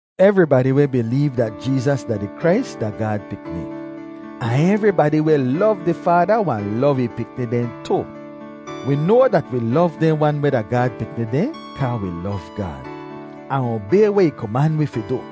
Evribadi weh bileev dat Jeezas da di Krais da Gaad pikni, ahn evribadi weh lov di Faada wahn lov ih pikni dehn tu. Wi noa dat wi lov dehn wan weh da Gaad pikni dehn kaa wi lov Gaad, ahn obay weh ih koman wi fi du.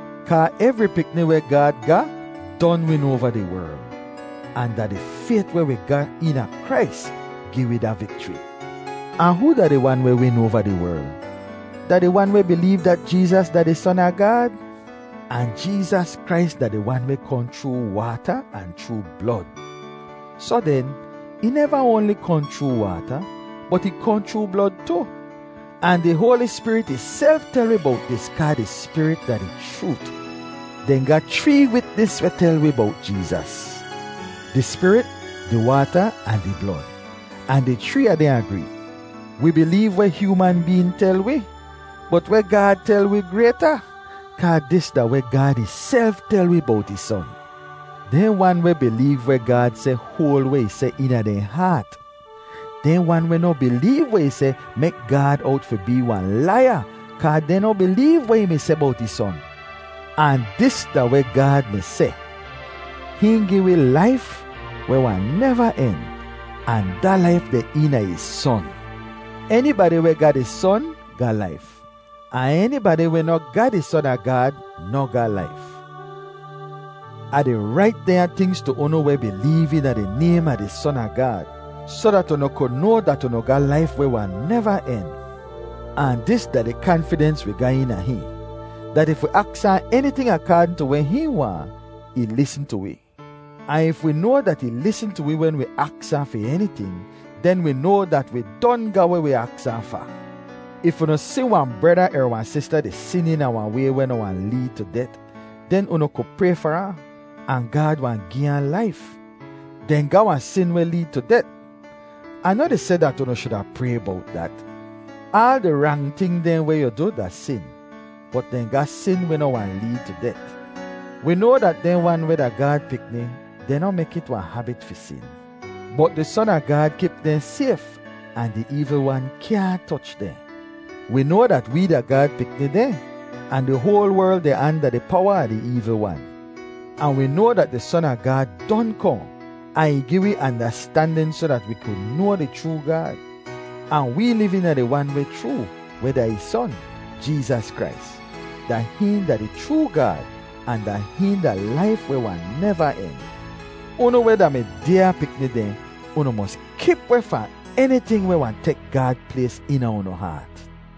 kaa evri pikni weh Gaad ga don win oava di werl, ahn da di fayt weh wi ga eena Krais gi wi da vikchri. Ahn hoo da di wan weh win oava di werl? Da di wan weh bileev dat Jeezas da di Son a Gaad. Ahn Jeezas Krais da di Wan weh kohn chroo waata ahn chroo blod. Soh den ih neva oanli kohn chroo waata, bot ih kohn chroo blod tu. Ahn di Hoali Spirit ihself tel wi bowt dis kaa di Spirit da di chroot. Dehn ga chree witnis weh tel wi bowt Jeezas: di Spirit, di waata ahn di blod; ahn di chree a dehn agree. Wi bileev weh hyooman been tel wi, bot weh Gaad tel wi grayta, kaa dis da weh Gaad ihself tel wi bowt ih Son. Dehn wan weh bileev weh Gaad seh hoal weh ih seh eena dehn haat. Dehn wan weh noh bileev weh ih seh mek Gaad owt fi bee wahn laiya kaa dehn noh bileev weh ih mi seh bowt ih Son. Ahn dis da weh Gaad mi seh: Hihn gi wi laif weh wahn neva en, ahn da laif deh eena ih Son. Enibadi weh ga di Son ga laif, ahn enibadi weh noh ga di Son a Gaad noh ga laif. Ah di rait dehnya tingz tu unu weh bileev eena di naym a di Son a Gaad, soh dat unu ku noa dat unu ga laif weh wahn neva en. Ahn dis da di kanfidens wi ga eena hihn, dat if wi aks ahn eniting akaadn tu weh hihn waahn, ih lisn tu wi. Ahn if wi noa dat ih lisn tu wi wen wi aks ahn fi eniting, den wi noa dat wi don ga weh wi aks ahn fa. If unu si wahn brada er wahn sista di sin eena wahn way weh noh wahn leed tu det, den unu ku pray far ahn, ahn Gaad wahn gi ahn laif. Dehn ga wahn sin weh leed tu det. Ah noh di seh dat unu shuda pray bowt dat. Aal di rang ting dehn weh yu du da sin, bot dehn ga sin weh noh wahn leed tu det. Wi noa dat dehn wan weh da Gaad pikni dehn noh mek it wahn habit fi sin, bot di Son a Gaad kip dehn sayf ahn di eevl wan kyaahn toch dehn. Wi noa dat wee da Gaad pikni dehn, ahn di hoal werl deh anda di powa a di eevl wan. Ahn wi noa dat di Son a Gaad don kohn, ahn ih gi wi andastandin soh dat wi ku noa di chroo Gaad; ahn wee liv eena di Wan weh chroo, weh da ih Son, Jeezas Krais. Da hihn da di chroo Gaad, ahn da hihn da laif weh wahn neva en. Unu weh da mi dyaa pikni dehn, unu mos kip weh fahn eniting weh wahn tek Gaad plays eena unu haat.